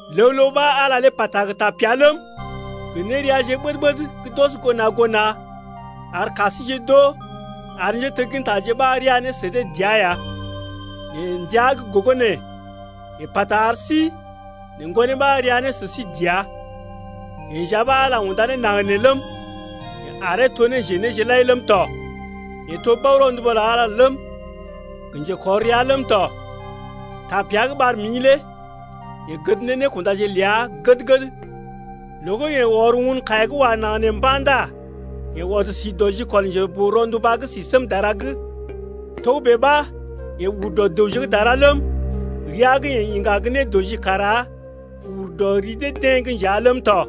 Ləw ləw ɓa Ala pata gə tapea ləm, gə néreaje ɓəd-ɓəd gə́ d’ɔs goo na̰ goo na̰ ar ka síje d’oo ar njéteggintaje ɓa ria ne sə dee dəa ya. Nɛ ndəa gə́ gogo nee, yeḛ pata ar sí nɛ Ŋgonee ɓa ria ne sə sí dəa. Yeḛ nja ɓa Ala unda ne naŋg nee ləm, yeḛ aree to njenéje lai ləm tɔ. Yeḛ to bao-ronduba lə Ala ləm, gə njekɔr rəa ləm tɔ. Tapea gə́ ɓar mḭ lé yeḛ gəd ne nékundaje ləa gəd-gəd. Loo gə́ yeḛ ɔr won kaiya gə́ wa naŋg nee mba̰ ndá yeḛ ɔd si dɔ jikɔl Njeboo-ronduba gə́ si sém dara’g. Togə́bè ɓa yeḛ ur dɔ dəwje gə́ dara ləm, ria gə́ yeḛ iŋga gə́ nédɔji kara ur dɔ ri dee-deḛ’g nja ləm tɔ.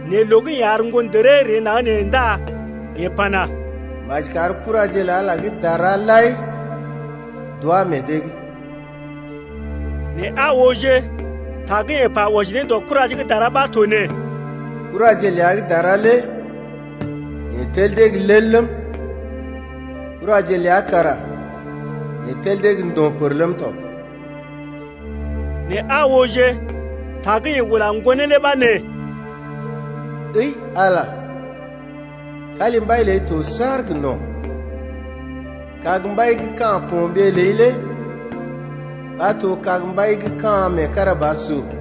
Nɛ loo gə́ yeḛ ar ŋgondəree ree naŋg nee ndá yeḛ pana: Maji kar kuraje lə Ala gə́ dara lai d’wá meḛ dee’g. Nɛ aa ooje, ta gə́ yeḛ pa wɔji ne dɔ kuraje gə́ dara ɓa to nee: Kuraje ləa gə́ dara lé yeḛ tel dee gə́ lel ləm, Kuraje ləa kara yeḛ tel dee gə ndo̰ pər ləm tɔ. Nɛ aa ooje, ta gə́ yeḛ ula Ŋgonee lé ɓa nee: Ǝi Ala, kalimbai ləi to saar gə no̰. Kag-mbai gə́ ka̰ ko̰ɓee ləi lé ɓa to kag-mbai gə́ ka̰ meekarabasur.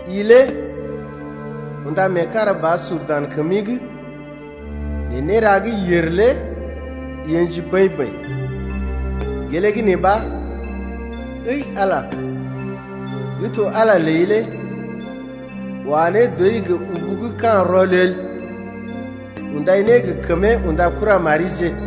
I lé unda meekarabasur dan kəmi’g nɛ néra gə́ yèr lé i ə̰ji bəḭ-bəḭ, Gelee gə́ nee ɓa, əi Ala, gə́ to Ala ləi lé Wa ne dɔi gə ubu gə́ ka̰ rɔlel Undai ne gə kəmee unda kuramarije.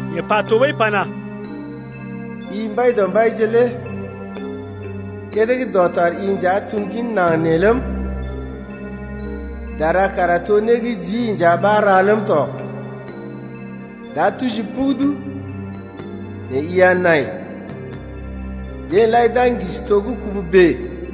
Yeḛ pa tɔɓəi pana: I Mbaidɔmbaije lé kédé gə́ dɔtar i nja tum gin naŋg nee ləm, Dara kara to né gə́ jii nja ɓa ra ləm tɔ. D’a tuji pugudu, nɛ i a nai, Deḛ lai d’a ŋgisi to gə́ kubu bèe.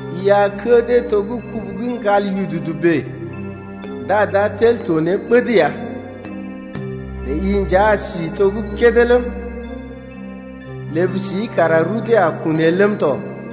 I a kə́ dee to gə́ kubu gə́ ŋgal yududu bèe Ndá d’a tel to ne ɓəd ya. Nɛ i nja a si to gə́ kédé ləm, Ləb sii kara rudee a kun el ləm tɔ.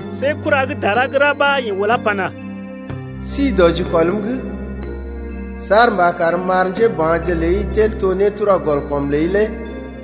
See kura gə́ dara gə́ ra ɓa yeḛ ulá pana: Si dɔ jikɔlm’g Saar mba karm m’ar njéba̰je ləi tel to nétura-gɔl-kɔm ləi lé wa.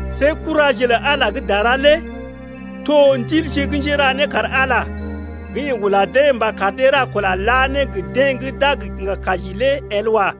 See kuraje lə Ala gə́ dara lé to ndilje gə́ njéra né kar Ala gə́ yeḛ ula dee mba kar dee ra kula la ne gə deḛ gə́ d’a gə kiŋga kaji lé el wa.